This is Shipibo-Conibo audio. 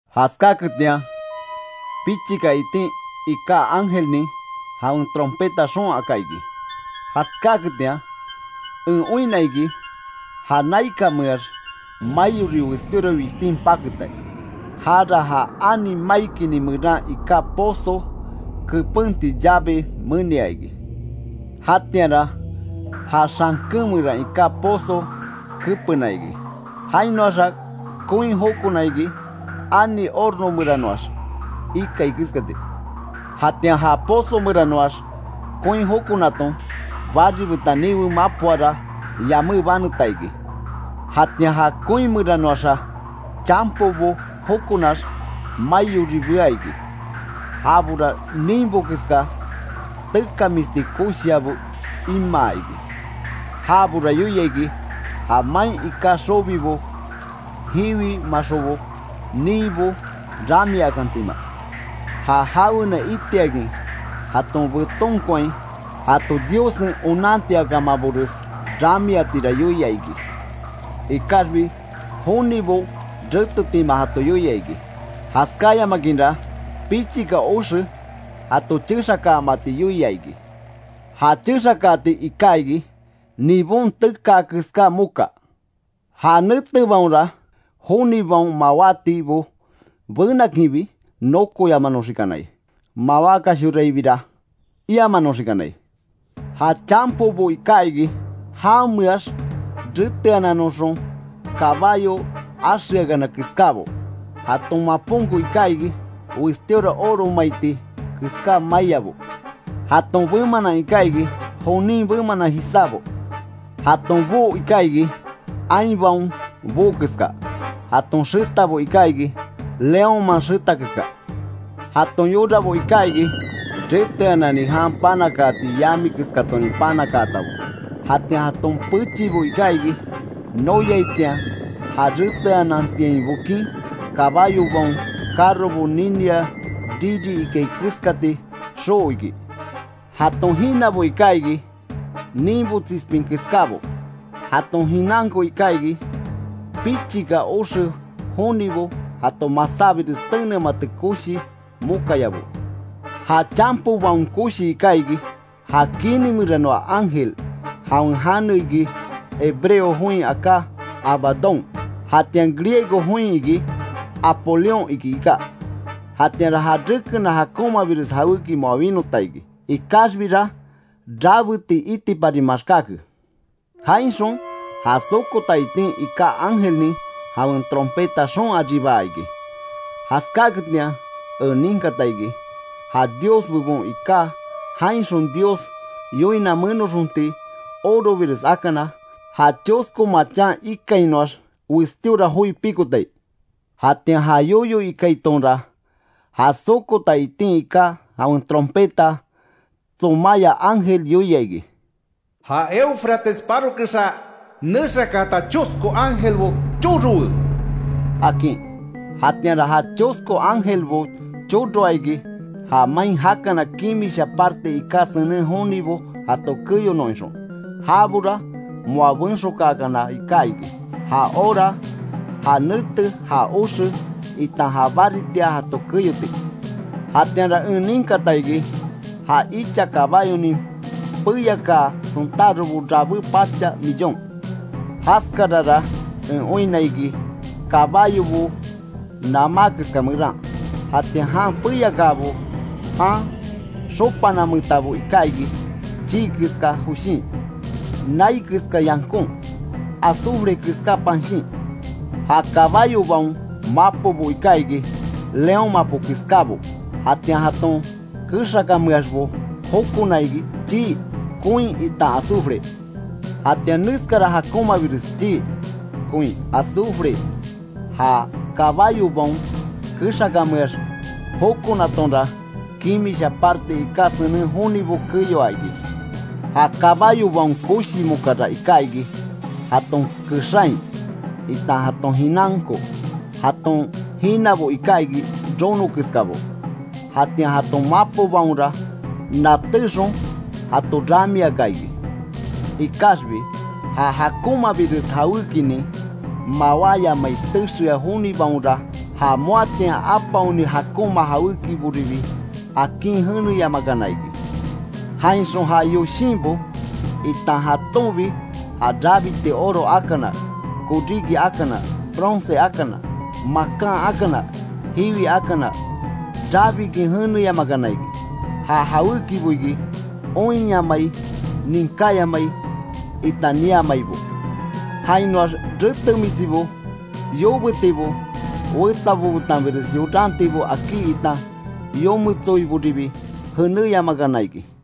Jaskáketian pichika itin iká ángelnin, jawen trompeta xoon aka iki. Jaskáaketian en oinna iki, ja naikanmeax maiori westíora wishtin paketa. Jára ja ani maikini meran iká pozo kepenti llave menia iki. Jatianra ja xanken meran iká pozo kepena iki. Jainoaxa koin jokona iki, ani horno meranoax ikai keskati. Jatian ja pozo meranoax koin jokonaton, bari betan niwe mapoara, yamé baneta iki. Jatian ja koin meranoaxa chanpobo jokonax, maiori bea iki. Jabora ninbo keska tekamisti koshiabo imaa iki. Jabora yoia iki, ja main iká xobibo, jiwi maxobo, niibo ramiakantima. Ja jawena itiakin jaton betonkoain jato Diossen onantiakamabores ramiatira yoia iki. Ikaxbi jonibo retetima jato yoia iki. Jaskáyamakinra pichika oxe jato chexakaamati yoia iki. Ja chexakaati iká iki, nibon tekaa keská moka. Ja netebaonra jonibaon mawátibo benakinbi nokoyamanoxikanai, mawákashoraibira iamanoxikanai. Ja chanpobo iká iki, jameax reteanannoxon kabayo axeakana keskábo. Jaton maponko iká iki, westíora oro maiti keská maiabo. Jaton bemanan iká iki, jonin bemanan jisábo. Jaton boo iká iki, ainbaon boo keska. Jaton xetabo iká iki, leónman xeta keska, jaton yorabo iká iki, reteanani jan panakaati yami keskatonin panakaatabo. Jatian jaton pechibo iká iki, noyaitian ja reteanantiain bokin, kabayobaon carrobo ninia riri ikai keskati xoo iki. Jaton jinabo iká iki, ninbo tsispin keskábo, jaton jinanko iká iki, pichika oxe jonibo jato masábires tenemati koshi mokayabo. Ja chanpobaon koshi iká iki, ja kini meranoa ángel; jawen jane iki, hebreo join aká Abadón, jatian griego join iki Apolión iki iká. Jatianra ja rekena jakonmabires jawéki moa winota iki. Ikaxbira rabeti itipari maxkáke. Jainxon ja sokota itin iká ángelnin, jawen trompeta xoon aribaa iki. Jaskáketian en ninkata iki, ja Dios bebon iká jainxon Dios yoina menoxonti orobires akana, ja chosko machan ikainoax westíora joi pikotai. Jatian ja yoyo ikaitonra, ja sokota itin iká, jawen trompeta tsomaya ángel yoia iki: “Ja Éufrates paro kexa nexakaata chosko Ángelbo chorowe”, akin. Jatianra ja chosko ángelbo choroa iki; ja main jakana kimisha parte iká senen jonibo jato keyonon ixon. Jabora moa benxokakana iká iki; ja hora, ja nete, ja oxe, itan ja baritia jato keyoti. Jatianra en ninkata iki, ja icha kabáyonin peyakaa sontárobo rabé pacha millón. Jaskarara en oinna iki, kabayobo namá keska meran; jatian jan peyakaabo jan xopanametabo iká iki, chii keska joshin, nai keska yankon, azufre keska panshin. Ja kabayobaon mapobo iká iki, león mapo keskábo; jatian jaton kexakanmeaxbo jokona iki, chii, koin itan azufre. Jatian neskara jakonmabires chii, koin, azufre, ja kabayobaon kexakameax jokonatonra, kimisha parte iká senen jonibo keyoa iki. Ja kabayobaon koshi mokara iká iki, jaton kexain, itan jaton jinanko. Jaton jinabo iká iki rono keskabo, jatian jaton mapobaonra natéxon jato ramiaka iki. Ikaxbi ja jakonmabires jawékinin mawáyamai texea jonibaonra, ja moatian apaokani jakonma jawékiboribi akin jeneyamakana iki. Jainxon ja yoshinbo, itan jatonbi ja rabiti oro akana, koríki akana, bronce akana, makan akana, jiwi akana, rabikin jeneyamakana iki. Ja jawékibo iki oinyamai, ninkáyamai itan niamaibo. Jainoax retemisibo, yobétibo, wetsabo betanbires yorantibo akí itan yometsoiboribi jeneyamakana iki.